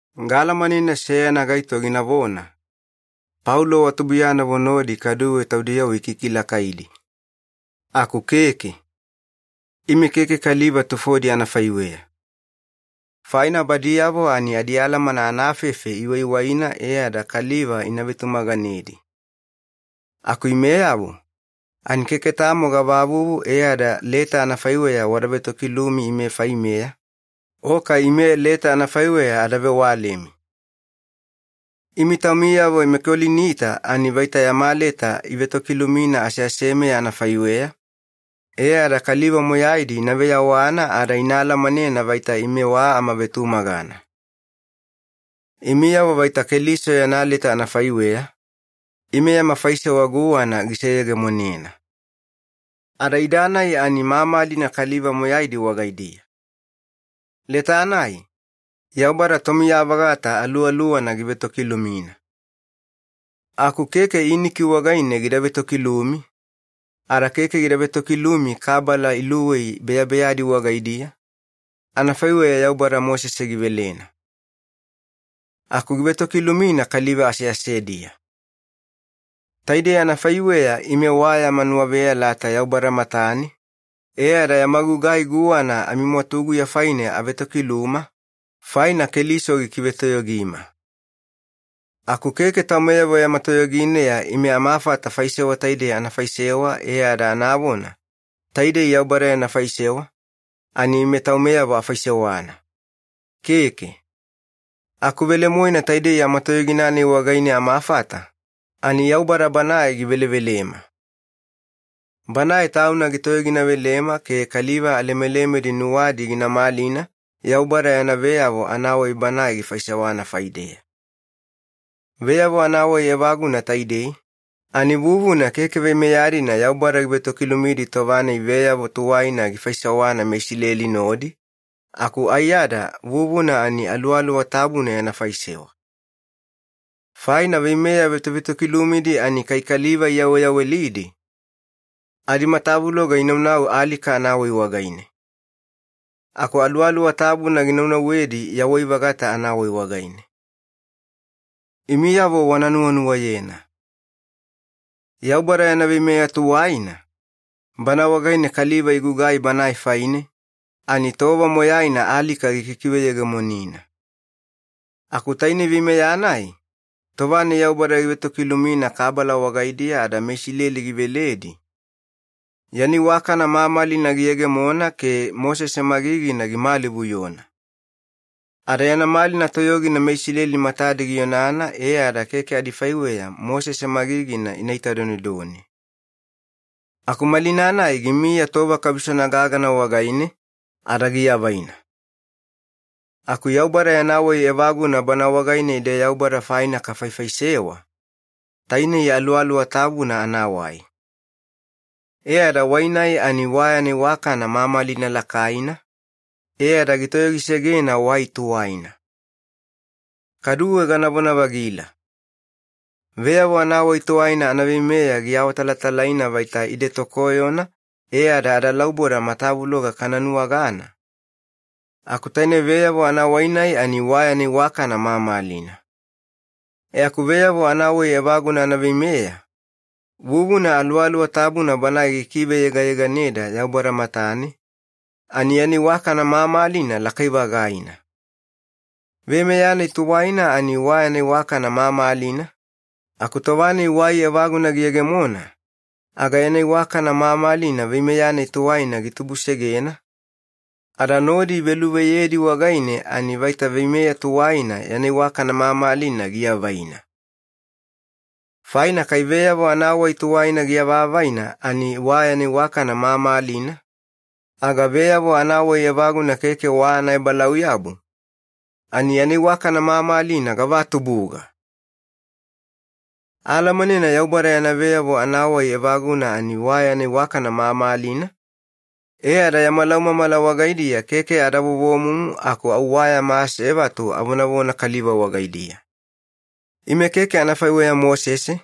Gaalamanena seyana gaito ginavona, “Paulo wa tubuiyanavo nodi kaduwe taudiyavo ikikilakaidi.” Aku keke. Ime keke kaliva tufodi anafaiweya. Faina badiyavo ani adialamana anafefe iwaiwaina e ada kaliva ina vetumaganedi. Aku imeyavo, ani keke tamo gavavuvu e ada leta anafaiweya wada vetokilumi ime faimeya, o kai ime leta anafaiweya ada vewalemi. Imi taumiyavo meKolinita ani vaita yama leta ivetokilumina aseasemeya anafaiweya, e ada kaliva moyaidi ina veyawana ada ina alamanena vaita ime wa amavetumagana. Imiyavo vaita Keliso yana leta anafaiweya, ime yama faisewa guwana giseyegemonena. Ada ida-nai ani mamalina kaliva moyaidi wagaidiya. Leta-nai, Yaubada Tomiya-vagata Aluwaluwana givetokilumina. Aku keke iniki wagaine gida vetokilumi, ada keke gida vetokilumi kabala iluwei beyabeyadi wagaidiya, anafaiweya Yaubada Mosese givelena. Aku givetokilumina kaliva aseasediya. Taidei anafaiweya ime wa yama nuwaveyalata Yaubada matane, e ada yama gugai guwana amimwatuguya faine avetokiluma, faina Keliso gikivetoyogima. Aku keke taumeyavo yama toyogineya ime amafata faisewa taidei ana faisewa e ada anavona, “Taidei Yaubada yana faisewa, ani ime taumeyavo afaisewana.” Keke. Aku velemoena taidei yama toyogina-nai wagaine amafata, ani Yaubada Banae givelevelema. Banae Tauna gitoyoginavelema ke kaliva alemelemedi nuwadi gina malina Yaubada yana veyavo anawai Banae gifaisewana faideya. Veyavo anawai evaguna taidei, ani vuvuna keke veimeya-dina Yaubada givetokilumidi tova-nai veyavo tuwaina gifaisewana meIsileli nodi, aku aiyada vuvuna ani Aluwaluwa Tabuna yana faisewa. Faina veimeya vetovetokilumidi ani kai kaliva iyaweyawelidi, adimatavuloga inaunau alika anawai wagaine. Aku Aluwaluwa Tabuna ginaunauwedi yawai-vagata anawai wagaine. Imiyavo wana nuwanuwayena. Yaubada yana veimeya tuwaina, bana wagaine kaliva igugai Banae faine, ani tova moyaina alika gikikiveyegemonina. Aku tainei veimeya-nai, tova-nai Yaubada givetokilumina kabala wagaidiya ada meIsileli giveledi, yana iwakana mamalina giyegemona ke Mosese magigina gimalivuyona. Ada yana malina toyogina meIsileli matadi gionana e ada keke adifaiweya Mosese magigina ina itadonedone. Aku malina-nai gimiya tova kabisona gagana wagaine, ada giavaina. Aku Yaubada yana wai evaguna bana wagaine ide Yaubada faina kafaifaisewa, tainei Aluwaluwa Tabuna anawai. E ada wai-nai ani wa yana iwakana mamalina lakaina, e ada gitoyogisegena wai tuwaina. Kaduwe ganavona-vagila. Veyavo anawai tuwaina anaveimeya giawatalatalaina vaita ide tokoyona e ada adalauboda matavuloga kana nuwagana, aku taine veyavo anawai-nai ani wa yana iwakana mamalina. E aku veyavo anawai evaguna anaveimeya, vuvuna Aluwaluwa Tabuna Banae gikiveyegayeganeda Yaubada matane, ani yana iwakana mamalina lakai-vagaina. Veimeya-nai tuwaina ani wa yana iwakana mamalina, aku tova-nai wai evaguna giyegemona, aga yana iwakana mamalina veimeya-nai tuwaina gitubusegena, ada nodi iveluveyedi wagaine ani vaita veimeya tuwaina yana iwakana mamalina giavaina. Faina kai veyavo anawai tuwaina giavavaina ani wa yana iwakana mamalina, aga veyavo anawai evaguna keke wa anaebalauyabu, ani yana iwakana mamalina gavatubuga! Aalamanena Yaubada yana veyavo anawai evaguna ani wa yana iwakana mamalina, e ada yama laumamala wagaidiya keke ada vovomumu aku au wa yama asevatu avonavona kaliva wagaidiya. Ime keke anafaiweya Mosese,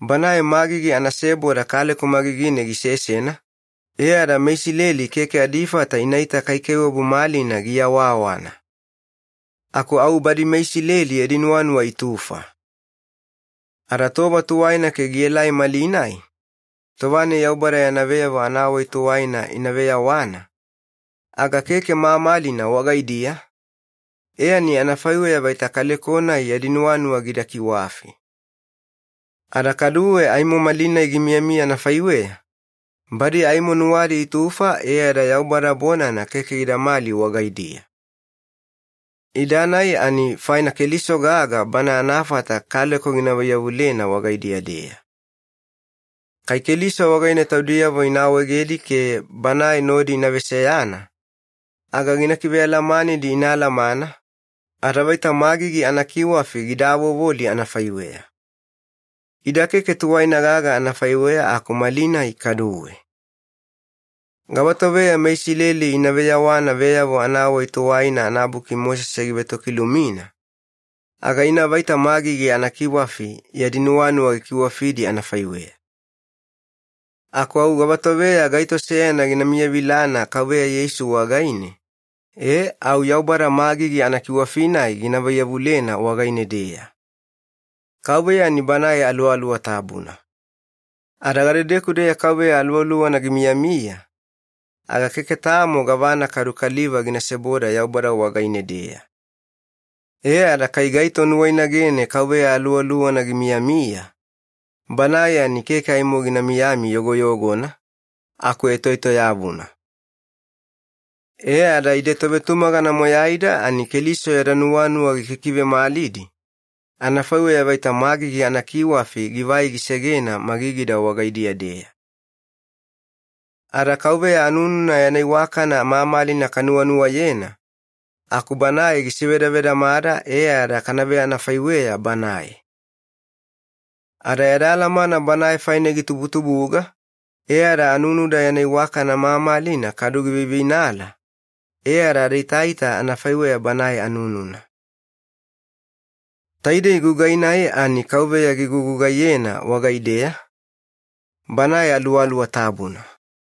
banae magigi anaseboda kaleko magigine gisesena, e ada meIsileli keke adifata inaita kaikaiwabu malina giawawana. Aku au badi meIsileli yadi nuwanuwa itufa. Ada tova tuwaina ke gielai malinai, tova-nai Yaubada yana veyavo anawai tuwaina ina veyawana, aga keke mamalina wagaidiya, e ani anafaiweya vaita kaleko-nai yadi nuwanuwa gida kiwafi. Ada kaduwe aimo malinai gimiyamiya anafaiweya, badi aimo nuwadi itufa e ada Yaubada bonana keke gidamali wagaidiya. Ida-nai ani faina Keliso gaga Bana anafata kaleko gina vaiyavulena wagaidiya-deya. Kai Keliso wagaine taudiyavo ina awaegedi ke Banae nodi ina veseyana, aga gina kivealamanidi ina alamana, ada vaita magigi anakiwafi gida avovoli anafaiweya. Ida keke tuwaina gaga anafaiweya aku malinai kaduwe. Gavatoveya meIsileli ina veyawana Veyavo Anawai Tuwaina anabuki Mosese givetokilumina, aga ina vaita magigi anakiwafi yadi nuwanuwa gikiwafidi anafaiweya. Aku au gavatoveya gaito seyana gina miyavilana Kauveya Yeisu wagaine, e au Yaubada magigi anakiwafi-nai gina vaiyavulena wagaine-deya. Kauveya ani Banae Aluwaluwa Tabuna. Ada gadedeku-deya Kauveya Aluwaluwana gimiyamiya, aga keke tamo gavana kadu kaliva gina seboda Yaubada wagaine-deya. E ada kai gaito nuwainagene Kauveya Aluwaluwana gimiyamiya, banae ani keke aimo gina miyami yogoyogona, aku etoetoyavuna. E ada ide tovetumagana moyaida ani Keliso yada nuwanuwa gikikivemalidi, anafaiweya vaita magigi anakiwafi givai gisegena magigida wagaidiya-deya. Ada Kauveya anununa yana iwakana mamalina kanuwanuwayena aku Banae gisevedavedamada e ada kana veanafaiweya Banae. Ada yada alamana Banae faine gitubutubuga e ada anunuda yana iwakana mamalina kadu giveiveinala, e ada adaitaita anafaiweya Banae anununa. Taidei gugai-nai ani Kauveya gigugugaiyena wagaideya, Banae Aluwaluwa Tabuna.